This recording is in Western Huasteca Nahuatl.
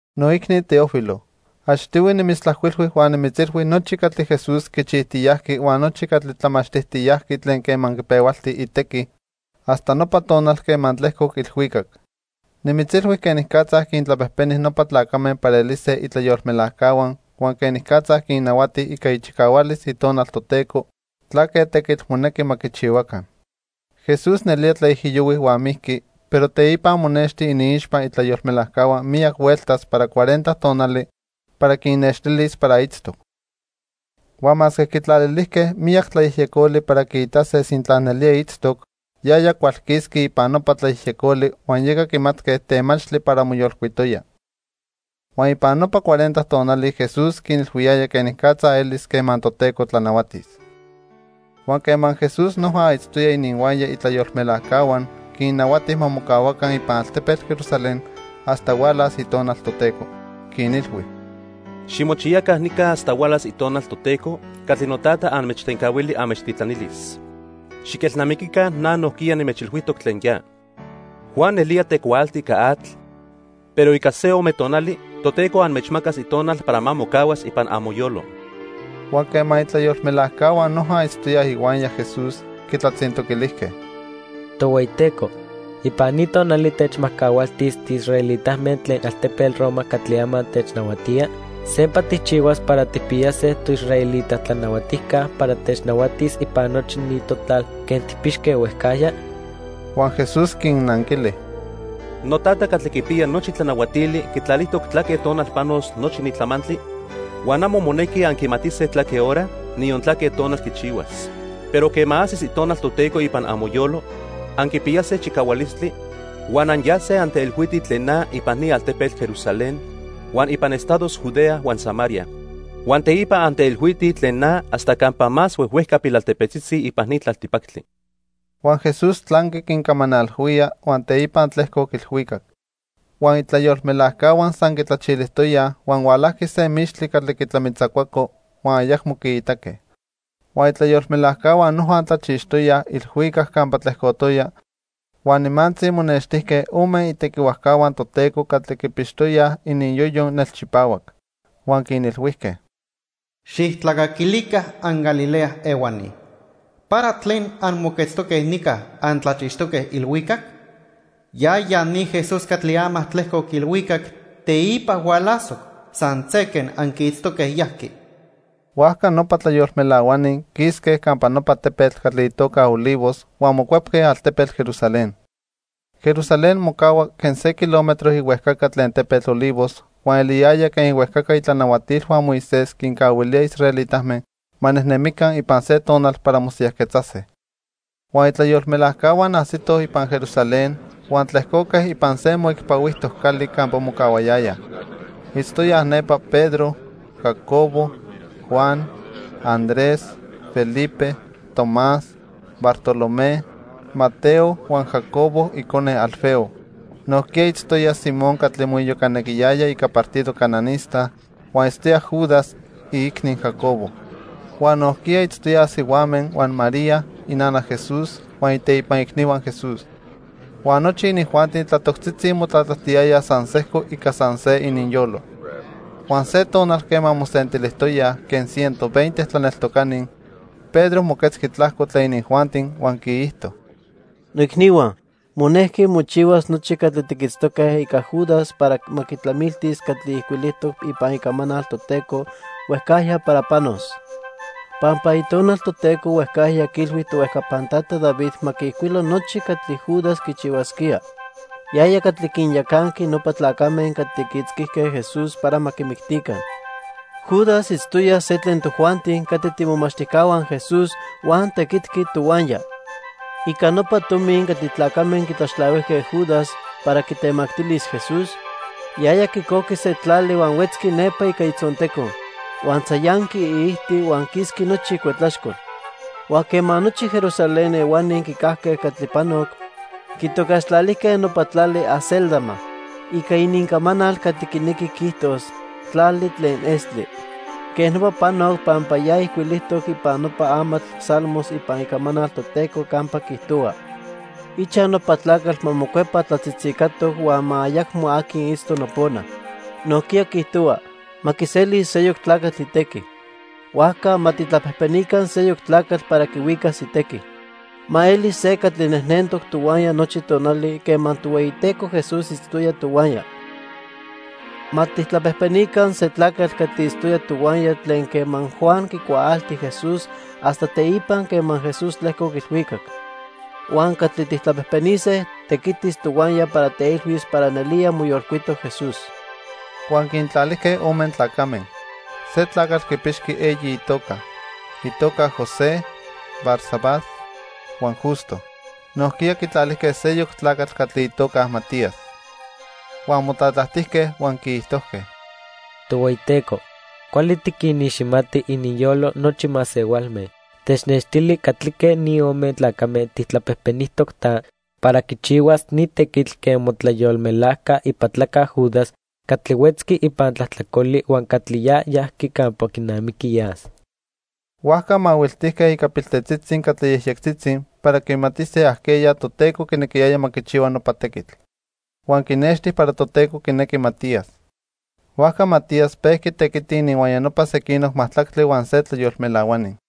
Noicni Teófilo, achtihui nimitztlajcuilhui huan nimitzilhui nochi catli Jesús quichijtiyajqui huan nochi catli tlamachtijtiyajqui tlen quema quipehualti itequi, hasta nopa tonal quema tlejcoc ilhuicac. Nimitzilhui quenicatza quintlapejpeni nopa tlacame para elise itlayolmelajcahua huan quenicatza quinnahuati ica ichicahualis Itonal Toteco tlaque tequitl monequi ma quichihuaca. Jesús nelía tlaijiyohui huan mijqui, pero teipa monexti iniixpa itlayolmelajcahua miyac hueltas para cuarenta tonali para quinnextilis para itztoc. Huan masque quitlalilijque miyac tlayejyecoli para quiitase sintla nelía itztoc, yaya cualquisqui ipan nopa tlayejyecoli huan yeca quimatque temachtli para moyolcuitoya. Huan ipan nopa cuarenta tonali Jesús quinilhuiyaya quenicatza elis quema Toteco tlanahuatis. Huan quema Jesús noja itztoya ininhuaya itlayolmelajcahua, quinnahuati ma mocahuaca ipan altepetl Jerusalén hasta hualas Itonal Toteco. Quinilhui: —Ximochiyaca nica hasta hualas Itonal Toteco catli Notata anmechtencahuili anmechtitlanilis. Xiquelnamiquica na nojquiya nimechilhuijtoc tlen ya. Juan nelía tecuaalti ica atl, pero ica se ome tonali Toteco anmechmacas Itonal para ma mocahuas ipan amoyolo. Huan quema itlayolmelajcahua noja itztoyaj ihuaya Jesús, quitlatzintoquilijque: —Tohueyiteco, ¿ipan ni tonali techmajcahualtis tiisraelitame tlen altepetl Roma catli ama technahuatía? ¿Sempa tijchihuas para tijpiyase toisraelita tlanahuatijca para technahuatis ipan nochi ni totlal quen tijpixque huejcajya? Huan Jesús quinnanquili: —NoTata catli quipiya nochi tlanahuatili quitlalijtoc tlaque tonal panos nochi ni tlamantli, huan amo monequi anquimatise tlaque hora, niyon tlaque tonal quichihuas. Pero quema ajsis Itonal Toteco ipan amoyolo, anquipiyase chicahualistli, huan anyase anteilhuitij tlen na ipan ni altepetl Jerusalén, huan ipan estados Judea huan Samaria. Huan teipa anteilhuitij tlen na hasta campa más huejhuejca pilaltepetzitzi ipan ni tlaltipactli. Huan Jesús tlanqui quincamanalhuía, huan teipa tlejcoc ilhuicac. Huan itlayolmelajcahua san quitlachilijtoyaj huan hualajqui se mixtli catli quitlamitzacuaco, huan ayacmo quiitaque. Huan itlayolmelajcahua noja tlachixtoyaj ilhuicac campa tlejcotoya huan nimantzi monextijque ome itequihuajcahua Toteco catli quipixtoyaj ininyoyo nelchipahuac. Huan quinilhuijque: —Xijtlacaquilica anGalilea ehuani, ¿para tlen anmoquetztoque nica antlachixtoque ilhuicac? Yaya ni Jesús catli ama tlejcoc ilhuicac teipa hualasoc san se quen anquiitztoque yajqui. Huajca nopa tlayolmelahuani quisque campa nopa tepetl catli itoca Olivos, huan mocuepque altepetl Jerusalén. Jerusalén mocahua quen se kilómetro ihuejcaca tlen tepetl Olivos, huan eliyaya quen ihuejcaca itlanahuatilhua Moisés quincahuilíaj israelitame ma nejnemica ipan se tonal para mosiyajquetzase. Huan itlayolmelajcahua ajsitoj ipan Jerusalén, huan tlejcoque ipan se moicpahuijtoc cali campa mocahuayayaj. Itztoyaj nepa Pedro, Jacobo, Juan, Andrés, Felipe, Tomás, Bartolomé, Mateo huan Jacobo icone Alfeo. Nojquiya itztoya Simón catli moiyocanequiyaya ica partido cananista, huan itztoya Judas, iicni Jacobo. Huan nojquiya itztoyaj sihuame huan María, inana Jesús, huan iteipan icnihua Jesús. Huan nochi inijuanti tlatoctzitzi motlatlajtiyayaj san sejco ica san se ininyolo. Huan se tonal quema mosentilijtoyaj quen ciento veinte tlaneltocani, Pedro moquetzqui tlajco tlen inijuanti huan quiijto: "Noicnihua, monejqui mochihuas nochi catli tiquitztoque ica Judas para ma quitlamiltis catli ijcuilijtoc ipan Icamanal Toteco huejcajya para panos. Pampa Itonal Toteco huejcajya quiilhui tohuejcapan tata David ma quiijcuilo nochi catli Judas quichihuasquía, yaya catli quinyacanqui nopa tlacame catli quiitzquijque Jesús para ma quimictica. Judas itztoya se tlen tojuanti catli tiimomachtijcahua Jesús huan tequitqui tohuaya. Ica nopa tomi catli tlacame quitlaxtlahuijque Judas para quitemactilis Jesús, yaya quicojqui se tlali huan huetzqui nepa ica itzonteco, huan tzayanqui iijti huan quisqui nochi icuetlaxcol. Huan quema nochi Jerusalén ehuani quicajque catli panoc, quitocaxtlalijque nopa tlali 'Acéldama' ica inincamanal catli quinequi quiijtos, 'Tlali tlen Estli.' Quej nopa panoc pampa ya ijcuilijtoc ipan nopa amatl Salmos ipan Icamanal Toteco campa quiijtohua: 'Ichaj nopa tlacatl ma mocuepa tlatzitzicatoc huan ma ayacmo aqui itzto nopona'. Nojquiya quiijtohua: 'Ma quiselis seyoc tlacatl itequi.' "Huajca ma tijtlapejpenica seyoc tlacatl para quihuicas itequi. Ma elis se catli nejnentoc tohuaya nochi tonali quema Tohueyiteco Jesús itztoya tohuaya. Ma tijtlapejpenica se tlacatl catli itztoya tohuaya tlen quema Juan quicuaalti Jesús hasta teipa quema Jesús tlejcoc ilhuicac. Huan catli tijtlapejpenise tequitis tohuaya para teilhuis para nelía moyolcuitoc Jesús." Huan quintlalijque ome tlacame. Se tlacatl quipixqui eyi itoca. Itoca José, Barsabás, huan Justo. Nojquiya quitlalijque seyoc tlacatl catli itoca Matías. Huan motlatlajtijque huan quiijtojque: "Tohueyiteco, cuali tiquiniximati ininyolo nochi masehualme. Technextili catlique ni ome tlacame tijtlapejpenijtoc ta, para quichihuas ni tequitl quen motlayolmelajca ipatlaca Judas catli huetzqui ipan tlajtlacoli huan catli ya yajqui campa quinamiqui yas." Huajca mahuiltijque ica piltetzitzi catli yejyectzitzi para quimatise ajqueya Toteco quinequiyaya ma quichihua nopa tequitl. Huan quinexti para Toteco quinejqui Matías. Huajca Matías pejqui tequiti ininhuaya nopa sequinoc majtlactli huan se tlayolmelahuani.